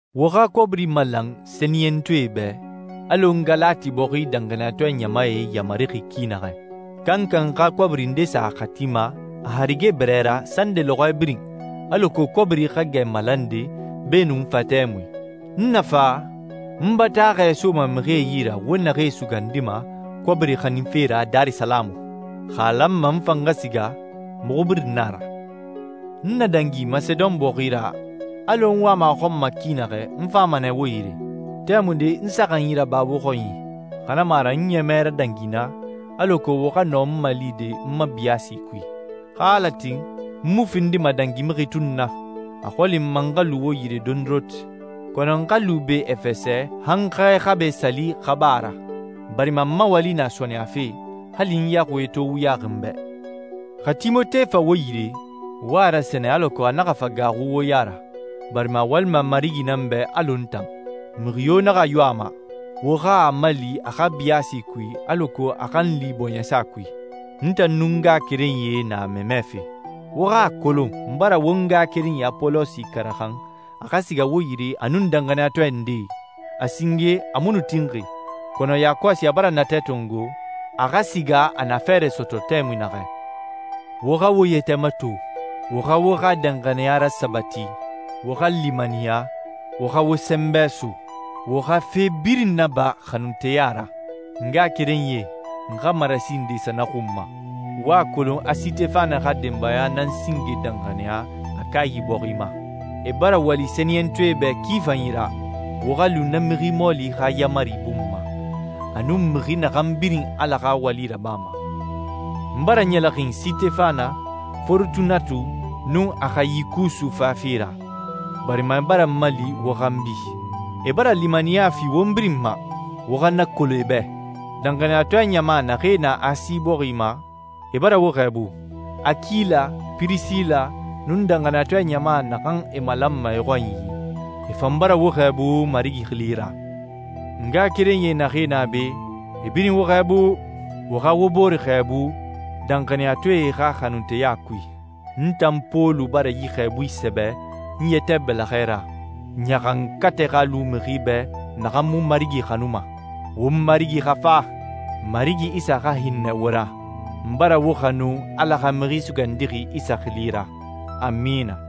Wo xa kɔbiri malan sɛniyɛntɔɛe bɛ, alɔ n Galati bɔxi danxaniyatɔɛ ɲamae yamarixi ki naxɛ. Kankan xa kɔbiri nde sa a xati ma a harige bɛrɛ ra sande lɔxɔɛ birin, alako kɔbiri xa gɛ malande beenun n fa tɛmui. N na fa, n bataaxɛ soma mixie yi ra wo naxee sugandima kɔbiri xaninfe ra Darisalamu. Xa a lanma n fan xa siga, muxu birin na a ra. N na dangi Masedon bɔxi ra, alɔ n wama a xɔn ma ki naxɛ, n fama nɛ wo yire. Tɛmunde n saxanyi raba wo xɔnyi, xa na mu a ra n ɲɛmɛ radangi naa, alako wo xa nɔ n malide n ma biyaasi kui. Xa Ala tin, n mu findima dangimixi tun na. A xɔli n ma n xa lu wo yire dondoronti. Kɔnɔ n xa lu be Efɛsɛ han Xɛ Xabɛ Sali xa ba a ra, barima n ma wali na sɔɔnɛyafe, hali n yaxuie to wuyaxi n bɛ. Xa Timote fa wo yire, wo a rasɛnɛ alako a naxa fa gaaxu wo ya ra, barima a walima Marigi nan bɛ alɔ n tan. Mixi yo naxa yo a ma. Wo xa a mali a xa biyaasi kui alako a xa n li bɔɲɛsa kui. N tan nun n ngaxakerenyie na a mamɛfe. Wo xa a kolon n bara won ngaxakerenyi Apolosi karaxan a xa siga wo yire a nun danxaniyatɔɛ ndee. A singe a mu nu tinxi, kɔnɔ yakɔsi a bara natɛ tongo a xa siga a na fɛɛrɛ sɔtɔ tɛmui naxɛ. Wo xa wo yɛtɛ mato, wo xa wo xa danxaniya rasabati, wo xa limaniya, wo xa wo sɛnbɛ so. Wo xa fe birin naba xanunteya ra. N ngaxakerenyie, n xa marasi nde sa na xun ma. Wo a kolon a Sitefana xa denbaya nan singe danxaniya Akayi bɔxi ma. E bara wali sɛniyɛntɔɛe bɛ ki fanyi ra. Wo xa lu na mixi mɔɔli xa yaamari bun ma, a nun mixi naxan birin Ala xa wali rabama. N bara ɲɛlɛxin Sitefana, Forotunatu, nun Axayikusu fafe ra, barima e bara n mali wo xanbi. E bara limaniya fi won birin ma. Wo xa na kolon e bɛ. Danxaniyatɔɛ ɲama naxee na Asi bɔxi ma e bara wo xɛɛbu. Akila, Pirisila, nun danxaniyatɔɛ ɲama naxan e malanma e xɔnyi, e fan bara wo xɛɛbu Marigi xili ra. Ngaxakerenyi naxee na be, e birin wo xɛɛbu. Wo xa wo bore xɛɛbu danxaniyatɔɛe xa xanunteya kui. N tan Pɔlu bara yi xɛɛbui sɛbɛ n yɛtɛ bɛlɛxɛ ra. Ɲaxankatɛ xa lu mixi bɛ naxan mu Marigi xanuma. Won Marigi xa fa. Marigi Isa xa hinnɛ wo ra. N bara wo xanu Ala xa Mixi Sugandixi Isa xili ra. Amina.